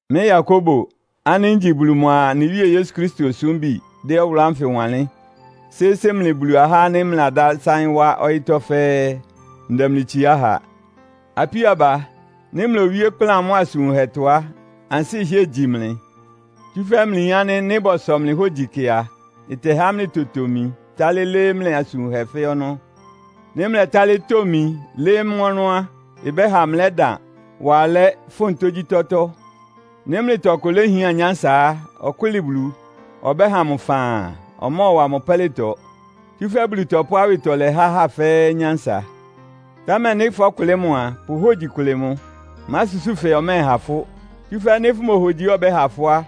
Mɩ́ Yakobo ánɩ́ ngyi Bulu mʋa anɩ Wíe Yesu Kristo osúmbi dɛ́ ɔwʋlʋ́ ánfɩ wanlɩ́n sɩ́sɩ́ mlɩ Bulu ahá ánɩ́ mlɩladásáɩ́n wá ɔyɩ́tɔ́ fɛ́ɛ́. Ndɛ mlɩ itsiá ha. Apíó aba, nɩ́ mlowíe ɩkplán mʋ́a asʋn wunhɛtɔ á, ansɩ́ ɩhɩ́ɛ gyi mlɩ. Tsúfɛ́ mlɩyin ánɩ́ nɩ́ bɔsɔ mlɩ hógyi kɩ a, ɩtɛhá mlɩtotomi tálɩ́ lɩ́ɩ́ mlɩ asʋn wunhɛ fɛ́ɛ́ ɔnɔ́. Nɩ́ mlɛtálɩ́ tomi lɩ́ɩ́ mʋ́ ɔnɔ́ á, ɩbɛ́ha mlɛ́dan, wá alɛ́, fʋ́n tógyítɔ́tɔ́. Nɩ́ mlɩtɔ ɔkʋ léhián nyánsa á, ɔkʋ́lɩ Bulu. Ɔbɛ́ha mʋ faan. Ɔmɔ́ɔwa mʋ pɛ́lɩtɔ, tsúfɛ́ Bulu tɔpʋ́ awɩtɔlɛ há ahá fɛ́ɛ́ nyánsa. Támɛ nɩ́ fɔ́kʋlɩ́ mʋ a, pʋ hógyi kʋlɩ mʋ. Másusúu fɛɛ ɔmɛ́ɛha fʋ́. Tsúfɛ́ nɩ́ fʋmohogyi ánɩ́ ɔbɛ́ha fʋ́ á,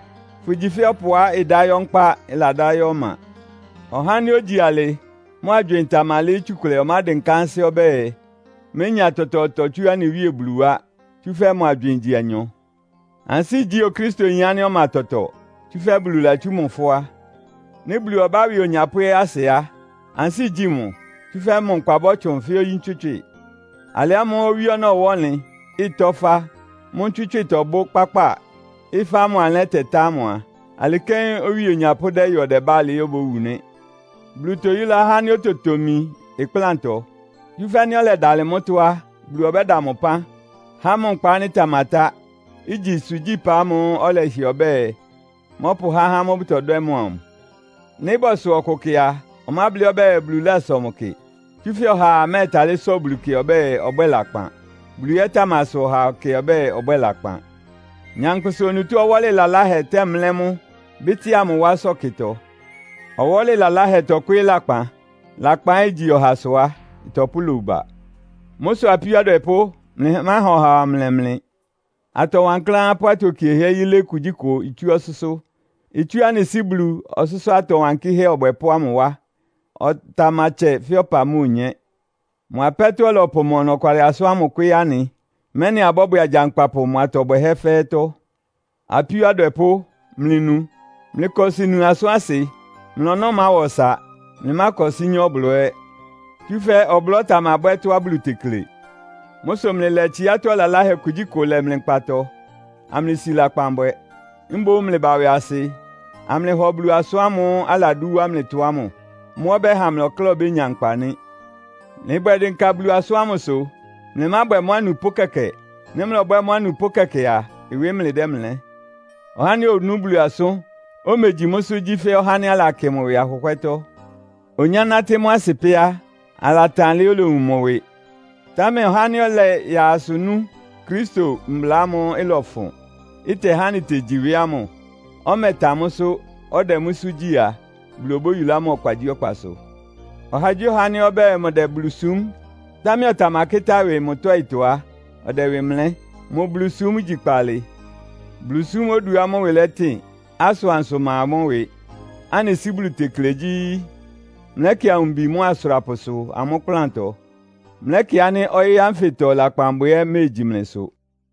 fʋgyi fɛ́ ɔpʋá ɩdá yɔ́ nkpá, ɩladá yɔ́ ɔma. Ɔhá ánɩ́ ogyi alɩ, mʋ agywɩɩn tamalɩ́ɩ́ tsukʋlɛ ɔmádɩnká ansɩ́ ɔbɛ́ɛ, ménya tɔtɔɔtɔ tsú anɩ Wíe Bulu wá, tsúfɛ́ mʋ agywɩɩn igyi anyɔ. Ansɩ́ igyí Okristoyin ánɩ́ ɔma tɔtɔ, tsúfɛ́ Bulu latsú mʋ fʋ́á. Nɩ́ Bulu ɔbá ɩwɩ onyapʋ́ ɛ́ asɩ á, ansɩ́ igyí mʋ. Tsúfɛ́ mʋ nkpa bɔ́tsʋn fɛ́ oyí ntswɩ́tswɩ. Alɩ ámʋ́ʋ́ owí ɔnɔ́ ɩwá ɔnlɩn, ɩtɔ́ ɩfá, mʋ́ ntswɩ́tswɩ tɔbʋ́ kpákpáa; ɩ́fá ámʋ alɛ́ tɛtá ámʋ a, alɩ kɛ́n ɩwɩ onyapʋ́ dɛ́yɔ ɔdɛbá alɩɩ obówu nɩ́. Bulu toyúlá ɔhá ánɩ́ ototomi ɩkplántɔ. Tsúfɛ́ nɩ́ ɔlɛdalɩ mʋ́tɔ́ á, Bulu ɔbɛ́da mʋ ɩpán, há mʋ nkpa ánɩ́ ɩtamatá, igyi ɩsʋgyí-ɩpa ámʋ́ʋ́ ɔlɛhɩɛ ɔbɛ́ɛ, mɔ́pʋhá ahá ámʋ́ʋ́ bʋtɔdwɛ́ mʋ amʋ. Nɩ́ bɔsɔ ɔkʋ kɩ a, ɔmáblɩ́ ɔbɛ́ɛ Bulu lásɔ mʋ kɩ, tsúfɛ́ ɔhaa mɛ́ɛtalɩ́ sɔ Bulu kɩ ɔbɛ́ɛ, ɔbwɛ́ɛ lakpan. Bulu ɛ́ tamasɔ ɔhaa kɩ ɔbɛ́ɛ, ɔbwɛ́ɛ lakpan. Nyankpʋsa onutó ɔwɔ́lɩ laláhɛ tɛ́mlɛ́ mʋ, bɩ́tɩ́a mʋ wá ɩsɔ́kɩtɔ. Ɔwɔ́lɩ laláhɛ tɔkwɩ́ɩ́ lakpan. Lakpan ɛ́ igyi ɔhasʋ á, ɩtɔpʋ́ lowu ba. Mʋ́ sʋ apíó adwɛpʋ́, mlɩmáha ɔhaa ɔmlɛ mlɩ. Atɔ wankláán pʋ́ atokiehɛ́ yilé kugyíkʋ itsú ɔsʋ́sʋ́. Itsú anɩ Sɩ́ Bulu, ɔsʋ́sʋ́ atɔ wankɩ́hɛ́ Ɔbwɛpʋ́ ámʋ wá. Ɔtamatsɛ fɛ́ ɔpa mʋ́a onyé. Mʋ apɛ́tɔ́ ɔlɔpʋ mʋ ɔnɔkwalɩ asʋ́n kwɩ́ɩ́ anɩ, mɛ́nɩ abɔ́bwɛ agyankpapʋ mʋ atɔ bwɛhɛ́ fɛ́ɛ́tɔ́. Apíó adwɛpʋ́, mlɩnu. Mlɩkɔsɩ nu asʋ́n asɩ. Mlɩ ɔnɔ́ máwa ɔsa. Mlɩmákɔsɩ́ nyá ɔblɔ́ ɛ́. Tsúfɛ́ ɔblɔ́ tamabwɛ́ tɔ́á Bulu tekle. Mʋ́ sʋ mlɩlɛ tsiátɔ́ laláhɛ kugyíkʋ lɛ mlɩ nkpatɔ, amlɩsi lakpan bwɛ. Mboún mlɩba ɩwɩasɩ, amlɩhɔ Bulu asʋ́n ámʋ́ʋ́ aladú wá mlɩtɔ ámʋ. Mʋ́ ɔbɛ́ha mlɩ ɔkláa obénya nkpa nɩ́. Mlɩbwɛ dɩnka Bulu asʋ́n ámʋsʋ, mlɩmábwɛ mʋ́ anupʋ́ kɛkɛ. Nɩ́ mlɔbwɛ́ mʋ́ anupʋ́ kɛkɛ a, ɩwɩ mlɩdɛ́mlɛ́. Ɔhá ánɩ́ onú Bulu asʋ́n, omegyi mʋ́sʋ́ gyí fɛ́ ɔhá ánɩ́ alakɩ mʋ ɩwɩ ahʋhwɛ́tɔ́. Onyánátɩ́ mʋ́ asɩ pɛ́ á, alatan alɩá olowun mʋ ɩwɩ. Támɛ ɔhá ánɩ́ ɔlɛyaa asʋ nú Kristo mbla ámʋ́ʋ́ ɩlɔfʋn, ɩtɛhá anɩtegyi ɩwɩ ámʋ, ɔmɛtan mʋ́sʋ́, ɔdɛ mʋ́sʋ́ gyí a, Bulu obóyulá mʋ ɔkpagyíɔkpasʋ. Ɔhagyíɔha ánɩ́ ɔbɛ́ɛ mʋdɛ Bulu súm, támɛ ɔtamakɩ́tá ɩwɩ mʋ tɔ́ɩtɔ á, ɔdɛ ɩwɩ mlɛ́. Mʋ Bulusúm igyi kpaalɩ. Bulusúm oduá mʋ́ ɩwɩ lɛtɩn, asʋansʋ ma mʋ́ ɩwɩ, anɩ Sɩ́ Bulu tekle gyí, mlɛ́kɩ awumbi mʋ́a asʋrapʋsʋ amʋ́ ɩkplántɔ. Mlɛ́kɩ ánɩ́ ɔyɩ́ ánfɩtɔ lakpanbwɛ ɛ́ iméegyi mlɩsʋ.